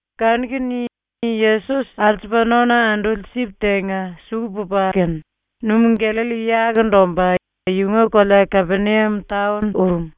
Kanu-kene Yesos alsupa nona anduli sip tenga suku pupa kene, Numú-⸤Gallalli⸥ yakundu omba yunga kolea ⸤Kapeniam taon⸥ urum.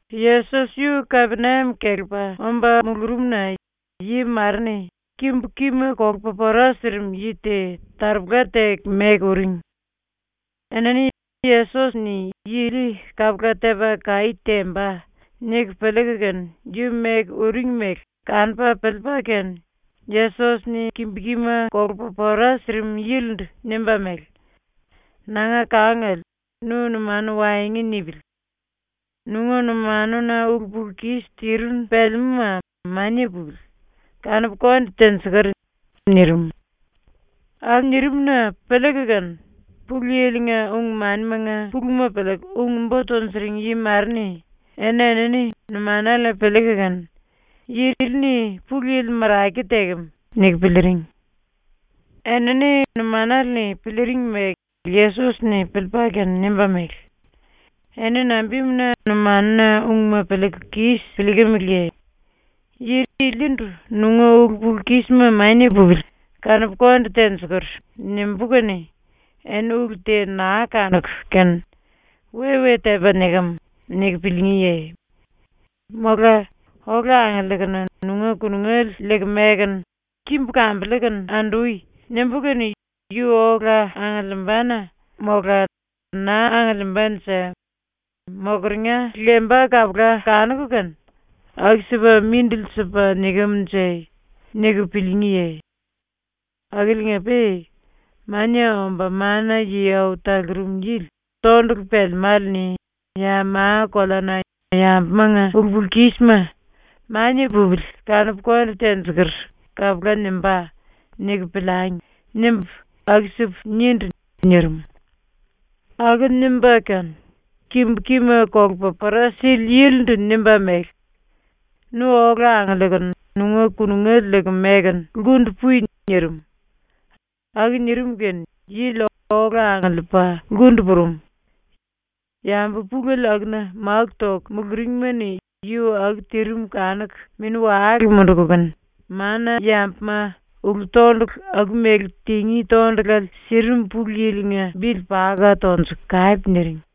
Yesos yu ⸤Kapeniam kelepa⸥ omba mulurumna yi mare-ni kimbu-kima kolupa pora sirim yi te taropola teku meku uring. Enini ‘Yesos-ni yi ili kapula tepa kaí temba.’ niku piliiku kene yu meku uring mele kanupa piliipa kene Yesos-ni kimbu-kima kolupa pora sirim yilindu nimba mele: “Nanga kangale, nu numanu waengu nipili. Nunga numanuna ulu-pulu-kis tirinu pelemúma mania pupili, kanupu konde tenjikur.” nirim. Aku nirim-na piliiku kene Pulu Yili-nga ung-manimanga puluma piliiku ung-bo tunjuring yi mare-ni eni-enini numanale-ni piliiku kene, ‘Yi ili-ni Pulu Yili marake tekem.’ niku piliiring. Enini numanale-ni piliiring mele Yesos-ni piliipa kene nimba mele: “Eni nambimuna numanuna ungma piliiku kis piliikimiliye? Yi ilindu “Nunga ulu-pulu-kísima mania pupili, kanupu konde tenjikur.” nimbú kene eni ulu te naa kanuku kene ‘We-we tepa nikem.’ niku piliingíye? Mola “Ola angiliikunu nunga kunungele liiku mekunu kimbu kambiliikinu andui.” nimbú kene yu ola angiliimbane mola naa angiliimbanje mokeringa lemba kapula kanuku kene ‘Aku-sipa mindili sipa nikem-nje?’ niku piliingíye? Akiliinga-pe ‘ ‘Mania Omba Mana-Yi Au Talurum Yili tondulu pelemále-ni ya ma-koleana yambumanga ulu-pulu-kísima “Mania pupili, kanupu konde tenjikur.” kapula nimbá.’ niku piliangi.’ nimbu aku-sipu nindu.” nirim. Aku nimba kene kimbu-kima kolupa pora sili yilindu nimba mele: “Nu ola angiliikunu nunga kunungele liiku mekunu lkundu pui.” nirim. Aku nirim kene yili ola angiliipa lkundu purum. Yambu pulele akuna máku toku muluringma-ni yu aku tirim kanuku mini-wale munduku kene, mana-yambuma ulu-tondulu aku-mele tingí tondulale sirim Pulu Yili-nga bili paka tonjuku kape niring.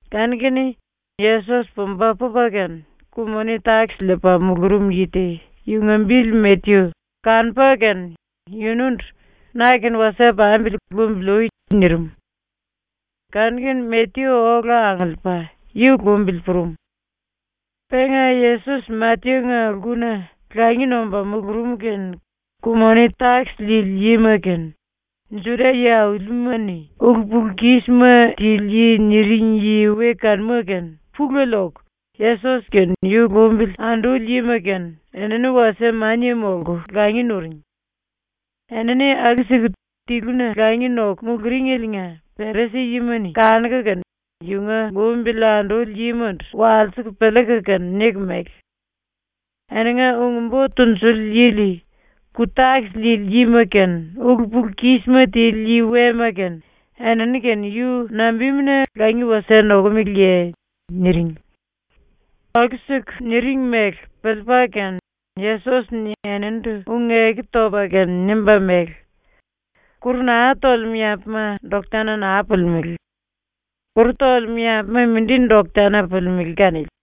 Kanu-kene Yesos pumba pupa kene, ku-moni-takis liipa mulurum yi te, yunga bili Matyu, kanupa kene yunundu “Na-kene wasie pambili lumbili ui.” nirim. Kanu-kene Matyu ola angiliipa yu lumbili purum. Penga Yesos Matyu-nga lkuna langi nomba mulurum kene ku-moni-takis liili yima kene, ⸤Juda-yi aulima-ni⸥ “ulu-pulu-kísima tili yi” ⸤niring⸥ yi we kanuma kene pulele oku Yesos kene yu lumbili anduli yima kene enini wasie mania molku langi nuring. ⸤Enini aku-siku tiluna langi noku muluringeliinga⸥ Perisi-yima-ni kanuku kene yunga lumbili anduli yimandu walsiku piliiku kene niku mele: “Eninga ung-bo tunjuli yili ku-takis liili yima kene ulu-pulu-kísima tili yi wema kene enini-kene yu nambimuna langi wasie nokomeleye?” niring. Aku-siku niring mele piliipa kene Yesos-ni eninindu ⸤ung-eku topa kene⸥ nimba mele: “Kuru naa tolemú yambuma doktana naa pulimelé. Kuru tolemú yambuma mindi doktana pulimelé kanili.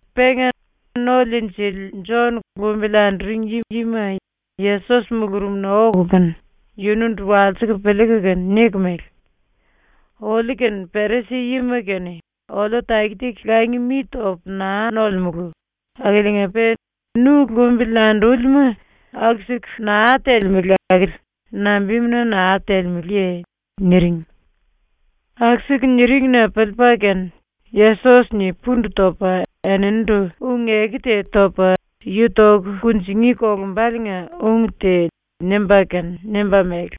Pe ⸤No-Liinjili⸥ Jon lumbili anduring yima Yesos mulurumna oku kene yunundu walsiku piliiku kene niku mele: “Oliu kene Perisi-yima kene oliu taki-taki langi mi topu naa nolemulu akiliinga-pe nu lumbili andúlima aku-siku naa telemele akili nambimuna naa telemeleye?” niring. ⸤Aku-siku niring-na piliipa kene⸥ Yesos-ni pundu topa eninindu ⸤ung-eku te topa yu toku kunjingí kolumbaliinga ung te nimba kene⸥ nimba mele: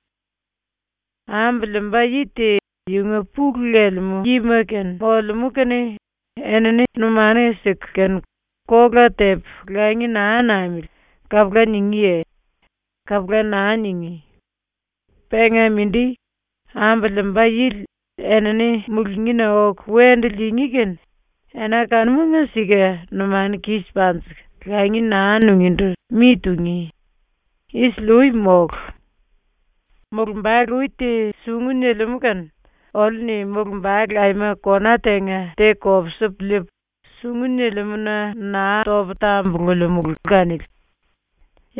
“Ambu liimba yi te yunga pulu lelemú yima kene molemú kene enini numanu siku kene “Kola tepu langi naa namili.” kapula ningíye? Kapula naa ningí. Penga mindi, ambu liimba yili enini mulungína oku wendu liingí kene ena kanumanga sika ⸤numanu kis panjiku⸥ langi naa nungíndu mi tungí. ⸤Isili-ui mólu.⸥ “Mulumbale ui te sungu nilimú kene oliu-ni mulumbale aima kona tenga te kopsipu liipu, sungu nilimúna naa topu tambululimulu kanili.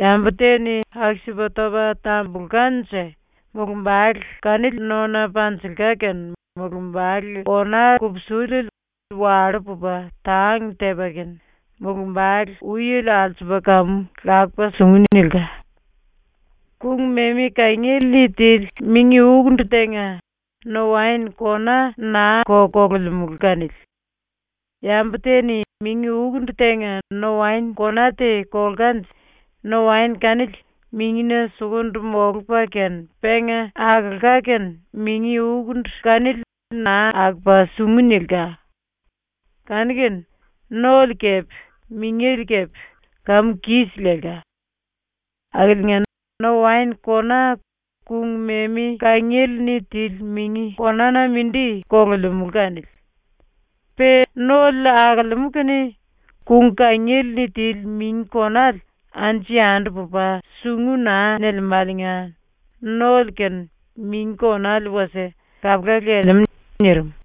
Yambu te-ni aku-sipa topa tambulkanje mulumbale kanili nona panjilka kene mulumbale kona kupsiliele wallú pupa tang tepa kene mulumbale-uiele alsupa kamu lakupa sungu nilka. “Kung-memi kangiele-ni tili mingi-ukundu tenga no-waen kona naa-ko kolemulu kanili. Yambu te-ni mingi-ukundu tenga no-waen kona te kolkanje no-waen kanili mingina sukundu molupa kene penga akolka kene mingi-ukundu kanili naa akopa sungu nilka. Kanu-kene nole kepe mingele kepe kamu kis lelka. Akiliinga, no-waen kona kung-memi kangiele-ni tili mingi konána mindi kolemulu kanili. ⸤Pe nole akolemú kene kangiele-ni tili mingi konale anju-yandu pupa sungu naa nilimáliinga⸥ nole kene mingi konale wasie kapula lelemú.” nirim.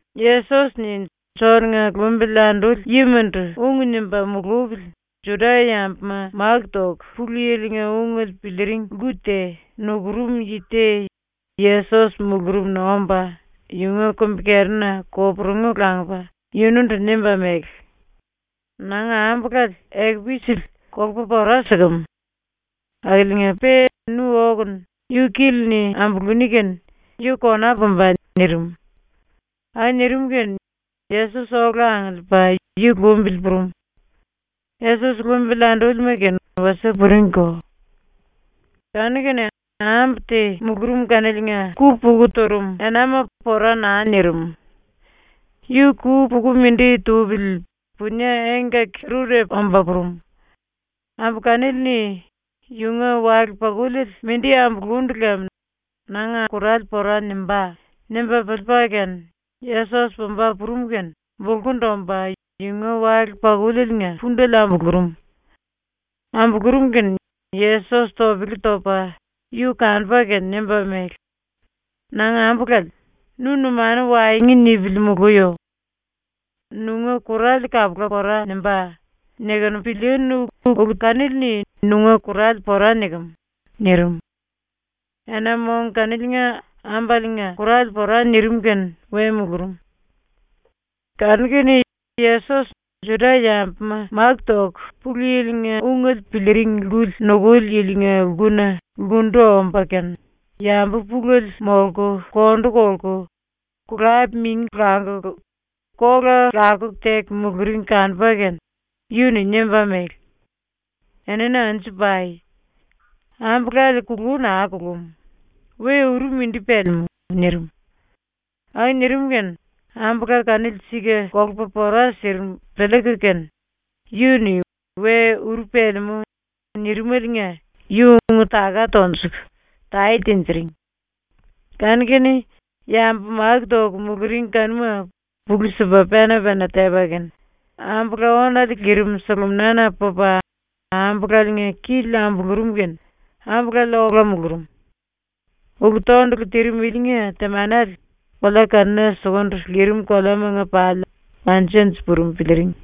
Yesos-ni Jon-nga lumbili anduli yimandu ung nimba mulupili ⸤Juda-yambuma máku toku Pulu Yili-nga ungele piliiring lku te⸥ nukurum yi te Yesos mulurumna omba yunga kumbi-kerina koporungu langupa yunundu nimba mele: “Nanga ambulale ekupu isili kolupa pora sikem. Akiliinga-pe nu okunu yu kili-ni ambuluní kene yu kona pumba.” nirim. Aku nirim kene Yesos ola angiliipa yu lumbili purum. Yesos lumbili andúlima kene wasie puringko. Kanu-kene ambu te mulurum kaniliinga ku-puku turum enama pora naa nirim. Yu ku-puku mindi tupili punie engkaki-rurepu omba purum. Ambu kanili-ni ‘Yunga wale-pakuliele mindi ambulundu lem nanga kurale pora nimbá.’ nimba piliipa kene Yesos pumba purum kene bulkundu omba, yunga wale-pakulieliinga pundele ambulurum. ⸤Ambulurum kene⸥ Yesos topele topa yu kanupa kene nimba mele: “Nanga ambulale, nu numanu waengu nipili muluyo. ‘Nunga kurale kapula pora nimbá.’ nikunu pilíínu ulu kanili-ni nunga kurale pora nikem.” nirim. Ena-mong kaniliinga ambaliinga kurale pora nirim kene we mulurum. Kanu-kene Yesos ⸤Juda-yambuma máku toku Pulu Yili-nga ungele piliiring lkuli⸥ nukuli yilinga lkuna lkundu omba kene yambu pulele molku kondu kolku, kulap-mingi languku, kola lakuku teku muluring kanupa kene yu-ni nimba mele: “Eni anju pai! Ambulale kulú naa kulum. We uru mindi pelemú.” nirim. Aku nirim kene ⸤ambula kanili sika kolupa pora sirim piliiku kene yu-ni “We uru pelemú.” nirimaliinga⸥ yu ung-taka tonjuku tae tinjiring. Kanu-kene yambu máku toku muluring kanuma pulú sipa pena-pena tepa kene ⸤ambula ónale lirim⸥ suluminana pupa ambulaliinga kili ambulurum kene ambulale ola mulurum. Ulu-tondulu tirim ilinga temanele kolea kanuna sukundu lirim koleamanga pali anju-anju purum piliiring.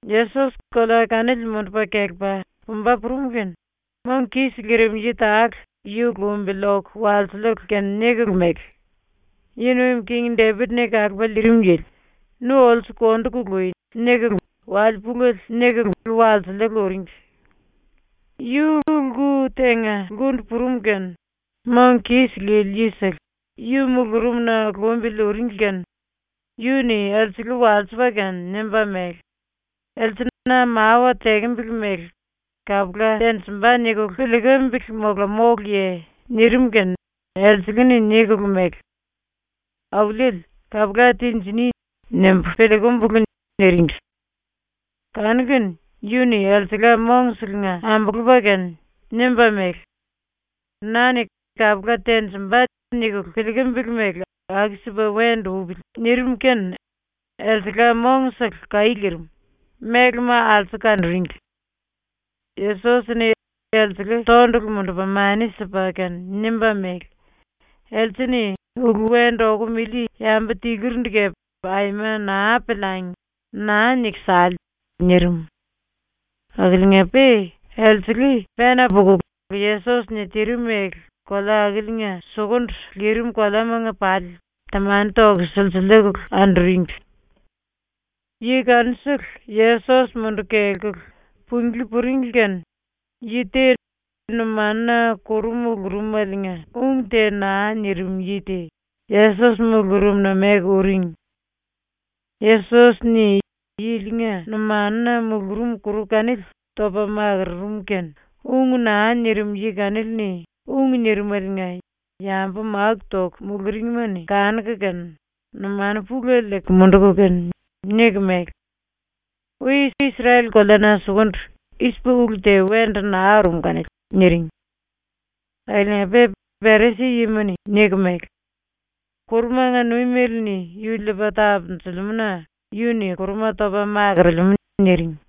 Yesos kolea kanili mundupa kelepa pumba purum kene mong kis lirim yi tale yu lumbili oku walsikulu kene nikulu mele: “⸤Yi Nuim King⸥ Depit-ni Kalupa Liirim Yili, nu olsu kondu kului.” nikulu wale pulele nikulu walsiliiku uringli. Yu lku tenga lkundu purum kene mong kis lili yisele yu mulurumna lumbili uringli kene yu-ni elsele walsipa kene nimba mele: “Else na mawa tekembele mele ‘Kapula tenjimba.’ nikulu piliikimbili mola móluye?” nirim kene elsele-ni nikulu mele: “Auliele, ‘Kapula tinjiní.’ nimbu piliikumbulu.” niringli. Kanu-kene yu-ni elsengla mongselenga ambulupa kene nimba mele: “Na-ni ‘kapula tenjimba.’ nikulu piliikimbili mele aku-sipa wendu upili.” nirim kene elsengla mongsele kaí lirim, mélema alsuku kanuringli. Yesos-ni elsele tondulu mundupa mani sipa kene nimba mele: “Else-ni ulu wendu okum ili yambu tiluri kepe aima naa piliangi, naa niku sale!” nirim. Akiliinga-pe elsele pena pukulu Yesos-ni tirim mele kolea akiliinga sukundu lirim koleamanga pali temani toku silsiliikulu anduringli. Yi kanusele Yesos munduku kelkulu punglí puringli kene yi te numanuna kuru mulurumeliinga ung te naa nirim yi te Yesos mulurumna meku uring. Yesos-ni yilinga numanuna mulurum kuru kanili topa makururum kene ung naa nirim yi kanili-ni ung nirimeliinga yambu máku toku muluringma-ni kanuku kene numanu pulele liiku munduku kene niku mele: “Ui Isrel-koleana sukundu i-sipa ulu te wendu naa urum kanili.” niring. Akiliinga-pe Perisi-yima-ni niku mele: “Kurumanga nuimele-ni yu liipa tapunjilimú-na yu-ni kuruma topa makorolemú.” niring.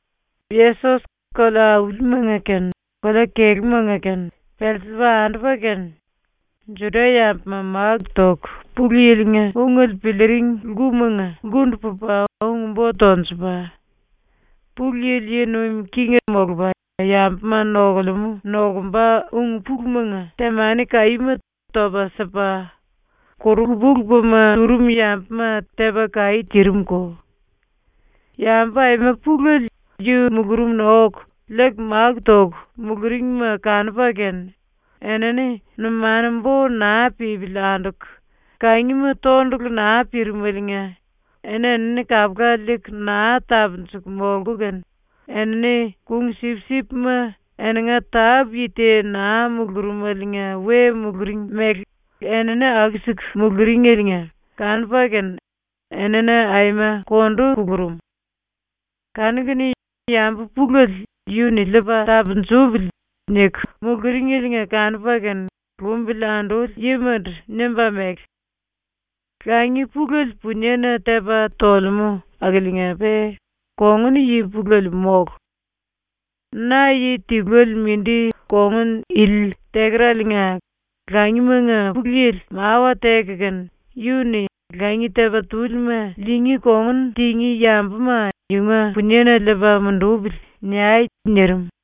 Yesos kolea-aulimanga kene, kolea-kelúmanga kene pelsiliipa andupa kene, Juda-yambuma máku toku Pulu Yili-nga ungele piliiring lkumanga lkundu pupa ung-bo tonjupa; Pulu Yili yi nuim king molupa yambuma nokulemú nokumba ung-pulumanga temani kaíma topa sipa; kuru lupa-lupama turum yambuma tepa kaí tirim-ko. Yambu aima pulele yu mulurumna oku liiku máku toku muluringma kanupa kene enini numanu-bo naa pípili anduku, kangima tondulu naa pirimeliinga eni-enini kapula liiku naa tapunjuku molku kene enini kung-sipsipma eninga tápu-yi te naa mulurumeliinga we muluring mele enini aku-siku muluringeliinga kanupa kene enini aima kondu kulurum. Kanu-kene ⸤yambu pulele ‘Yu-ni liipa tapunjupili.’ niku muluringeliinga kanupa kene⸥ lumbili anduli yimandu nimba mele: “Langi pulele puniena tepa tolemú akiliinga-pe kongun-yi pulele mólu. ⸤Na yi tiluele mindi kongun ili tekeraliinga⸥ langimanga Pulu Yili mawa teku kene yu-ni “Langi tepa-túlima liingí kongun tingí yambuma yunga puniena liipa mundupili.” niai.” nirim.